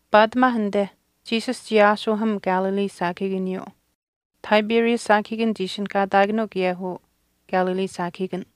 Paatimaa anite Jesus chii aashuuham Galilee saakahiikaniyuu. Tiberias saakahiikan chii ishinihkaataakanuu kaye uu Galilee saakahiikan.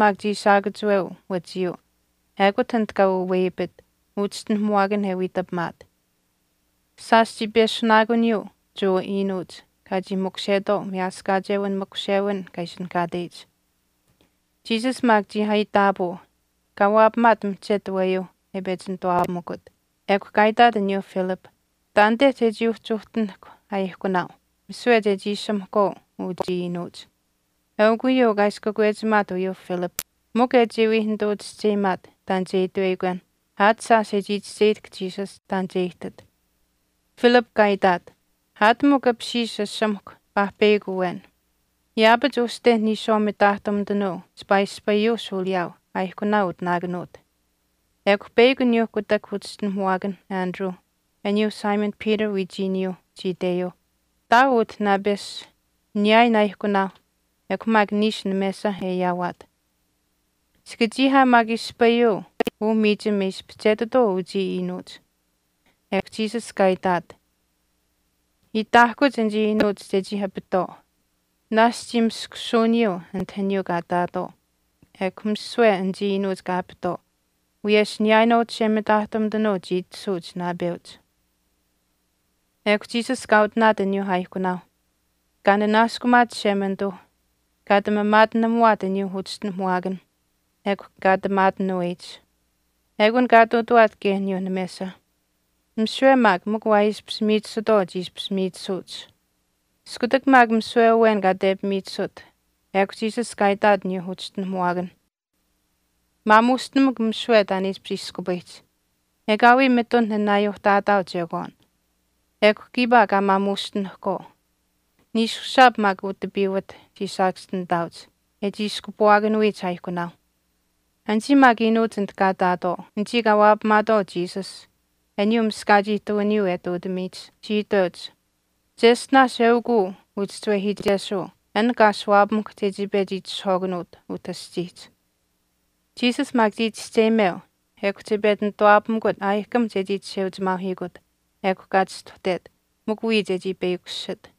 Jesus maak chii shaakachuweu wachiyu ekut anit kaa waweyapit uchischinuhamuwaakan e wiitapimaat. Shaash chii peshunaakuniyuu aniyuu Jewa iinuuch kaa chii makushetwaau Miyaaskaachewin makushewin kaa ishinihkaateyich. Jesus maak chii aitaapuu kaa waapamaat mihchetu aweyuuh e pechi nituwaapamikut, ekw kaa itaat aniyuu Philip, “Taanite chechii uhtinahk aaihkunaau misiwe chechii ashamahkwaau uchii iinuuch.” Eukw uyuu kaa ishi kakwechimaat uyuuh Philip mikw e chii wii nituu chischeyimaat taan che itweyikwen aat shaash e chii chischeyihtahk Jesus taan che ihtit. Philip kaa itaat, “Aat mikw apishiish ashamahkw paahpeyakw awen, yaapach uste niishwaau mitaahtumitanuu chipaa ispayuu shuuliyaau aaihkunaau utinaakanuut.” Ekw peyakw aniyuu kutak uchischinuhamuwaakan Andrew, aniyuu Simon Peter wiichiinuu chii iteyuuh, “Ihtaau utah naapesh niyaayin aaihkunaauh ekw maak niishu namesa e ayaawaat. Chika chii aa maak ispayuu uu miichim e ispihchetitwaau uchii iinuuch.” Ekw Jesus kaa itaat, “Itaahkuch anichii iinuuch chechii apitwaau.” Naashch chii maskushiyuuniyuu anit aniyuu kaa ihtaatwaau. Ekw misiwe anichii iinuuch kaa apitwaau, wiyesh niyaayinwaau chishemitaahtumitanuu chii itashuuch naapeuch. Ekw Jesus kaa utinaat aniyuu aaihkunaau, kaa nanaaskumaat Chishemanituu kaa ati maamaatinamuwaat aniyuu uchischinuhamuwaakan ekw kaa ati maatinuweyich. Ekun kaa ihtuutuwaat kaye aniyuu namesa. Misiwe maak mikw waa ishpish miichisutwaau chii ishpish miichisuuch. Iskutak maak misiwe awen kaa tepimiichisut, ekw Jesus kaa itaat aniyuuh uchischinuhamuwaakan, “Maamuustinamukw misiwe taan e ishpish iskupayihch, ekaawii mitun nanaayuuhtaataau chekwaan.” Ekw kiipaa kaa maamuushtinihkwaau, niishushaap maak utipiiwat chii saakaschinitaauch e chii iskupuwaakanuyich aaihkunaauh. Anichii maak iinuuch anit kaa ihtaatwaau, anichii kaa waapamaatwaau Jesus aniyuu miskach ihtuwiniyuu e ihtuutamiyich chii iteuch, “Cheshtinaash eukw uu uchischiwehiichesuu an kaa ashuwaapamuhkw chechii pechi itishahwaakanuut utah aschiihch.” Jesus maak chii chischeyimeu ekw che pechi nituwaapamikut aayihkam che wii chisheuchimaauhiikut, ekw kaa chistuhtet, mikw wiya chechii peyakushit.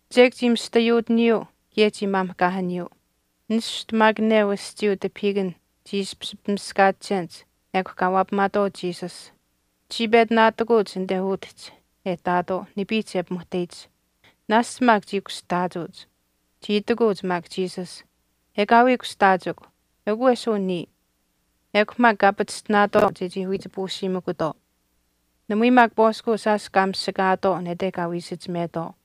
Chek chii mista yuutiniyuu kaye chii maamihkaahaniyuu. Nishtu maak neu aschiiyuu tipahiikan chii ishpish pimiskaachenich ekw kaa waapamaatwaau Jesus. Chii pechi naatikuuch anite utihch e ihtaatwaau nipiihch e pimuhteyich. Naashch maak chii kushtaachuuch. Chii itikuuch maak Jesus, “Ekaawii kushtaachikw, eukw wesin niya.” Ekw maak kaa pachishtinaatwaau chechii wiich puusiimikutwaau. Namui maak pwaaskuu shaash kaa mishikaatwaau nete kaa wii isichimetwaau.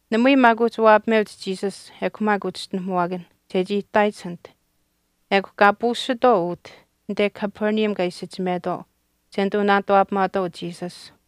Namui maak uhchi waapameuch Jesus ekw maak uchischinuhamuwaakanh chechii ihtaayich anit ekw kaa puusitwaau utih anite Capernaum kaa isichimetwaau che nituu naanituwaapamaatwaau Jesus.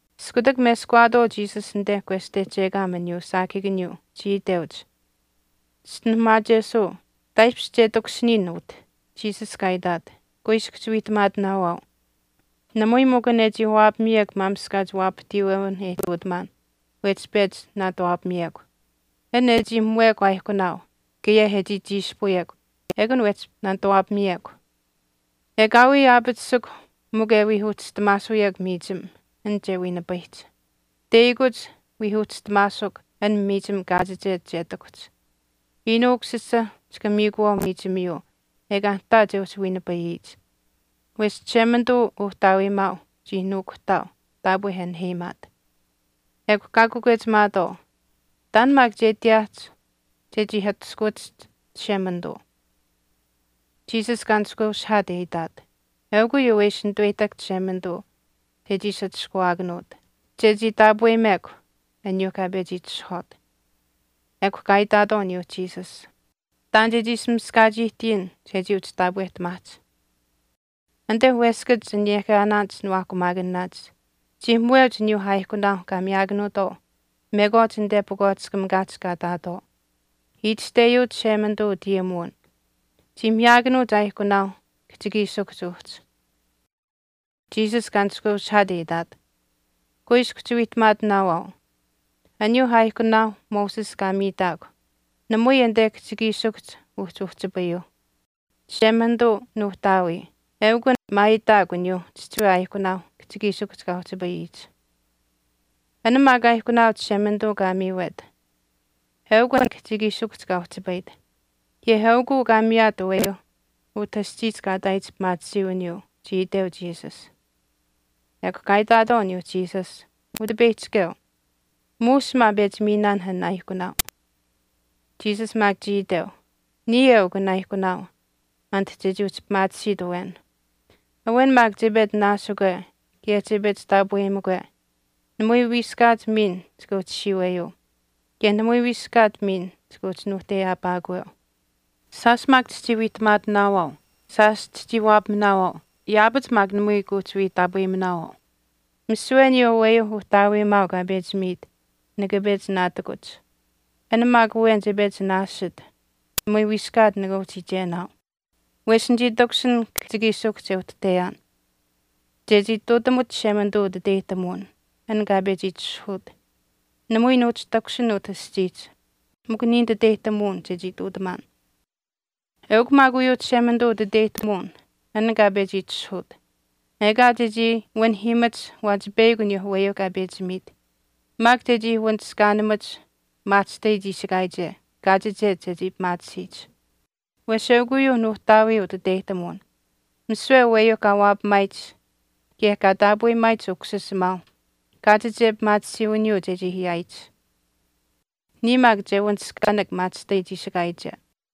Iskutak meskawaatwaau Jesus anite kwestehchekaam aniyuu saakahiikaniyuu chii iteuch, “Chischinuhamaachesuu taaishpish kaa takushiniyin utah.” Jesus kaa itaat, “Kuiskw chiwiihtamaatinaawaau, namui mikw an e chii waapamiyekw maamishkaach waapahtiiwewinh e ihtuutamaan wehchi pechi naanituwaapamiyekw. An e chii muwekw aaihkunaau kaye e chii chiishpuyekw ekun wehchi naanituuwaapamiyekw. Ekaawii aapatisikw mikw e wii uhchistamaasuyekw miichim an che wiinipayihch, teyakuch wii uhchistamaasuk an miichim kaachiche che ihtakuhch. Iinuu Ukusisa chika miikuwaau miichimiyuu ekaa nihtaa che uhchi wiinipayihch. Wesh Chishemanituu Uhtaawiimaau chii nuukuhtaau taapwe e naheyimaat.” Ekw kaa kakwechimaatwaau, “Taan maak che ihtiyaahch chechii atushkuwachiht Chishemanituu.” Jesus kaa nishkweushihaat e itaat, “Eukw uyuu e ishi nituweyihtahk Chishemanituu chechii ishi atushkuwaakanuut, chechii taapweyimekw aniyuu kaa pechi itishahwaat.” Ekw kaa itaatwaau aniyuu Jesus, “Taan chechii ishi miskaach ihtiyin chechii uhchi taapweyimataahch. Anite weskach aniyaahkaanaanich niwaahkumaakanaanich chii muweuch aniyuu aaihkunaau kaa miyaakanuutwaau mekwaach anite pakwaatiskamikaahch kaa ihtaatwaau. Itashteyuu Chishemanituu utayimuwin, Chii miyaakanuuch aaihkunaau kihchikiishikuhch uhchi.” Jesus kaa nishkweushihaat e itaat, “Kuiskw chiwiihtamaatinaawaau, aniyuu aaihkunaau Moses kaa miitaakw namui anite kihchikiishikuhch uhchi uhchipayuuh. Chishemanituu, Nuuhtaawii eukw an maayitaakw aniyuu chihchiwe aaihkunaau kihchikiishikuhch kaa uhchipayihch. An maak aaihkunaau Chishemanituu kaa miiwet eukw an kihchikiishikuhch kaa uhchipayit, kaye eukuu kaa miyaat aweyuuh utah aschiihch kaa ihtaayich pimaatisiiwiniyuu,” chii iteu Jesus. Ekw kaa itaatwaau aniyuu Jesus, “Utipeyihchikeu, muush maa pechi miinaan an aaihkunaau.” Jesus maak chii iteu, “Niya eukw an aaihkunaau anit chechii uhchi pimaatisiit awen. Awen maak che pechi naasikwe kaye che pechi taapweyimikwe, namui wiiskach miin chika uhchi siiweyuu kaye namui wiiskaat miin chika uhchi nuuhteyaapaakweu. Shaash maak chichii wiihtamaatinaawaau, shaash chichii waapaminaawaau yaapach maak namui kuuhchiwii taapweyiminaawaau. Misiwe aniyuu aweyuu Uhtaawiimaau kaa pechi miit nika pechi naatikuch. An maak awen che pechi naasit namui wiiskaat nika uhchi iichenaau. Wesh nichii takushin kihchikiishikuhch e uhtuhteyaan chechii ihtuutamuch Chishemanituu utiteyihtamuwin, an kaa pechi itishahuut. Namui nuuhchi takushin utah aschiihch mikw niya nititeyihtamuwin chechii ihtuutamaan. Eukw maak uyuu Chishemanituu utiteyihtamuwin an kaa pechi itishahuut, ekaa chechii wanihiimach waachipeyakw aniyuu aweyuu kaa pechi miit, maak chechii wanishkaanimach maahchishtai chiishikaayiche kaachiche chechii pimaatisiyich. Wesh eukw uyuu Nuuhtaawii utiteyihtamuwin, misiwe aweyuu kaa waapamaayich kaye kaa taapweyimaayich Ukusisimaau kaachiche pimaatisiiwiniyuu chechii ayaayich. Niya maak che wanishkaanak maahchishtai chiishikaache.”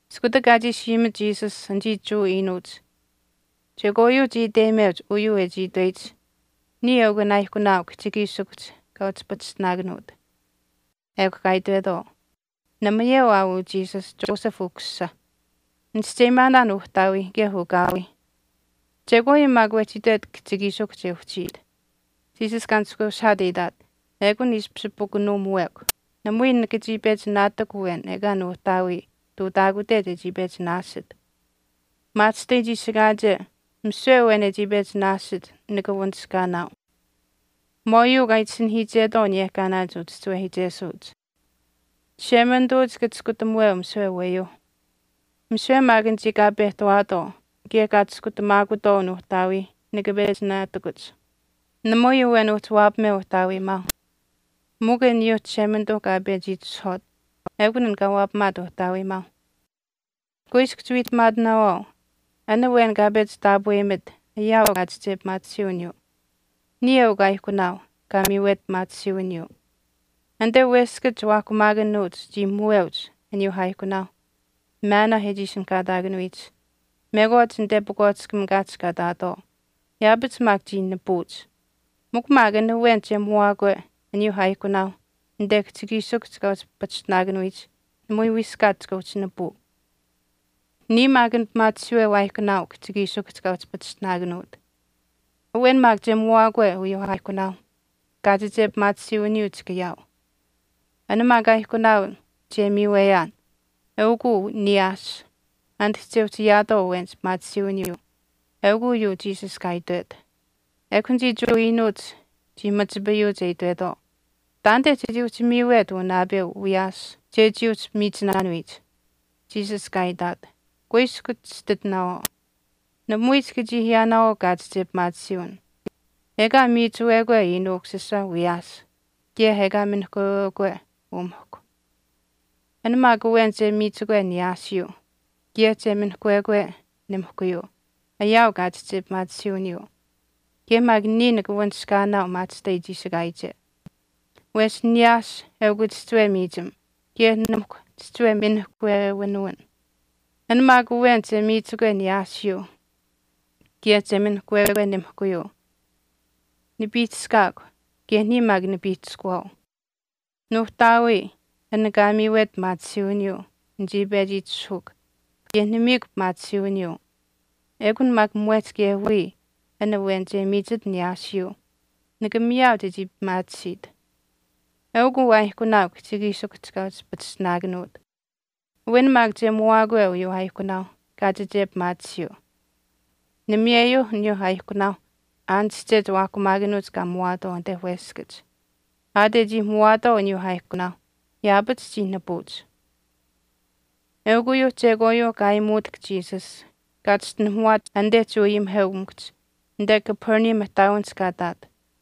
Iskutak kaa chiishi ayimit Jesus, anichii Jewa iinuuch chekwaayuu chii iteyimeuch uyuu e chii itweyich, “Niya eukw an aaihkunaau kihchikiishikuhch kaa uhchi pachishtinaakanuut.” Ekw kaa itwetwaau, “Namayeu aa uu Jesus, Joseph ukusisa. Nichischeyimaanaan uhtaawiih kaye ukaawii. Chekwaayuu maak wehchi itwet kihchikiishikuhch e uhchiit.” Jesus kaa nishkweushihaat e itaat, “Ekun ishpish pukunuumuwekw. Namui nika chii pechi naatikw awen ekaa Nuuhtaawii ihtuutaakute chechii pechi naasit. Maahchishtai chiishikaache misiwe awen e chii pechi naasit nika wanishkaanaau. Mwaauyuu kaa itasinahiichetwaau aniyehkaanaanich uchischiwehiichesuuch, Chishemanituu chika chiskutamuweu misiwe aweyuuh. Misiwe maak anichii kaa pehtawaatwaau kaye kaa chiskutamaakutwaau Nuuhtaawii nika pechi naatikuch. Namui awen uhchi waapameu Uhtaawiimaau mikw aniyuuh Chishemanituu kaa pechi itishahwaat eukun an kaa waapamaat Uhtaawiimaau. Kuiskw chiwiihtamaatinaawaau, an awen kaa pechi taapweyimit ayaau kaachiche pimaatisiiwiniyuu. Niya eukw aaihkunaau kaa miiwet pimaatisiiwiniyuu. Anite weskach chiwaahkumaakanuuch chii muweuch aniyuuh aaihkunaau maanaa e chii ishinihkaataakanuyich, mekwaach anite pakwaatiskamikaahch kaa ihtaatwaau. Yaapach maak chii nipuuch. Mikw maak an awen che muwaakwe aniyuu aaihkunaau anite kihchikiishikuhch kaa uhchi pachishtinaakanuyich, namui wiiskaat chika uhchi nipuu. Niya maak an pimaachihiiweu aaihkunaau kihchikiishikuhch kaa uhchi pachishtinaakanuut. Awen maak che muwaakwe uyuu aaihkunaau kaachiche pimaatisiiwiniyuu chika ayaau. An maak aaihkunaau che miiweyaan eukw uu niyaas anit chechii uhchi ayaatwaau awenich pimaatisiiwiniyuu.” Eukw uyuu Jesus kaa itwet. Ekw anichii Jewa iinuuch chii machipayuuch e itwetwaau, “Taanite chechii uhchi miiwet uu naapeu wiyaas chechii uhchi miichinaanuyich.” Jesus kaa itaat, “Kuiskw chititinaawaau, namui chika chii ayaanaawaau kaachiche pimaatisiiwin ekaa miichuwekwe Iinuu Ukusisa wiyaas kaye ekaa minihkwewekwe umihkw. An maak awen che miichikwe niyaasiyuu kaye che minihkwewekwe nimihkuyuu ayaau kaachiche pimaatisiiwiniyuu, kaye maak niya nika wanishkaanaau maahchishtai chiishikaayiche. Wesh niyaas eukw chihchiwe miichim kaye nimihkw chihchiwe minihkwewinuwin. An maak awen che miichikwe niyaasiyuu kaye che minihkwekwe nimihkuyuu, nipiihchishkaakw kaye niya maak nipiihchishkuwaau. Nuuhtaawii an kaa miiwet pimaatisiiwiniyuu nichii pechi itishahuukw kaye nimiikw pimaatisiiwiniyuu. Ekun maak mwehch kaye wiya an awen kaa miichit niyaasiyuu, nika miyaau chechii pimaatisiit. Eukw uu aaihkunaau kihchikiishikuhch kaa uhchi pachishtinaakanuut. Awen maak che muwaakwe uyuu aaihkunaau kaachiche pimaatisiyuu. Namiyeyuu aniyuu aaihkunaau aanische chiwaahkumaakanuuch kaa muwaatwaau anite weskach, aat e chii muwaatwaau aniyuu aaihkunaau yaapach chii nipuuch.” Eukw uyuuh chekwaayuu kaa aayimuutahk Jesus kaa chischinuhamaachet anite Jewa ayimiheukamikuhch anite Capernaum ihtaawinihch kaa ihtaat.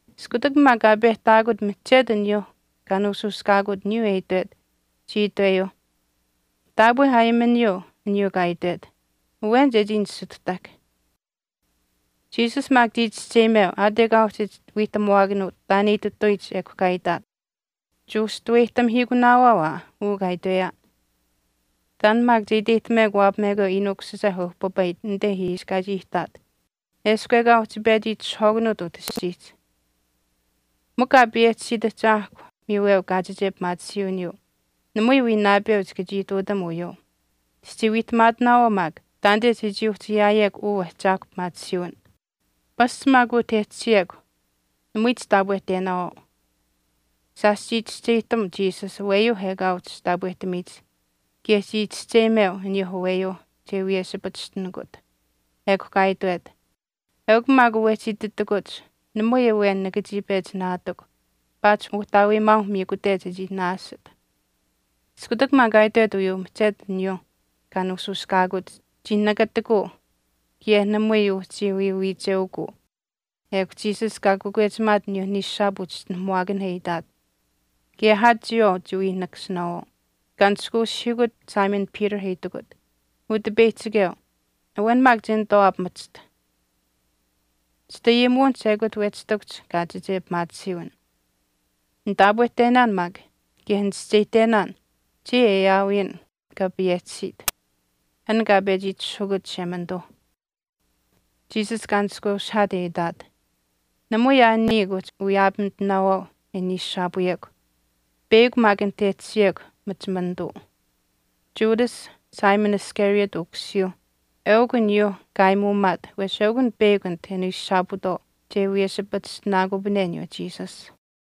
Iskutak maak kaa pehtaakut mihchetu aniyuu kaa nuushuushkaakut aniyuu e itwet, chii itweyuuh, “Taapwe aayimaniyuu aniyuu kaa itwet, awen chechii nisituhtahk.” Jesus maak chii chischeyimeu, aat ekaa uhchi wiihtamuwaakanuut, taan e itituyich ekw kaa itaat, “Kuushtuweyihtamihiikunaawaau aa uu kaa itweyaan. Taan maak che iteyihtamekw waapamekwe Iinuu Ukusisa e uhpipayit anite ishi kaa chii ihtaat eshkw ekaa uhchi pechi itishahwaakanuut utah aschiihch. Mikw Kaa payehchisiit Ahchaahkw miiweu kaachiche pimaatisiiwiniyuu, namui wii naapeu chika chii ihtuutam uyuu. Chichii wiihtamaatinaawaau maak taanite chechii uhchi ayaayekw uu Ahchaahkw pimaatisiiwin. Pasch maak utah e tashiyekw namui chitaapweyihtenaawaau.” Shaash chii chischeyihtam Jesus aweyuu ekaa che uhchi taapwehtamiyich kaye chii chischeyimeu aniyuu aweyuu che wiyeshipachishtinikut. Ekw kaa itwet, “Eukw maak wehchi ititakuch namui awen nika chii pechi naatikw paatish Uhtaawiimaau miikute chechii naasit.” Iskutak maak kaa itwet uyuu mihchetu aniyuuh kaa nuushuushkaakut chii nakatikuu kaye namui uhchiwii wiicheukuu. Ekw Jesus kaa kakwechimaat aniyuu niishushaap uchischinuhamuwaakanh e itaat, “Kaye aa chiyawaau chiwii nikasinaawaau.” Kaa nishkweushihiikut Simon Peter e itikut, “Utipeyihchikeu, awen maak che nituwaapamachiht. Chitayimuwinihch ekut wehchi ihtakuhch kaachiche pimaatisiiwin. Nitaapwehtenaan maak kaye nichischeyihtenaan chiya e aawiyin kaa payehchisiit, an kaa pechi itishahukut Chishemanituu.” Jesus kaa nishkweushihaat e itaat, “Namui aa niya kuuhchi wiyaapamitinaawaau e niishushaapuyekw, peyakw maak anit e tashiyekw machimanituu.” Judas, Simon Iscariot ukusiyuu eukw aniyuu kaa aayimuumaat wesh eukw an peyakw anit e niishushaapuutwaau che wiyeshipachishtinaakupane aniyuu Jesus.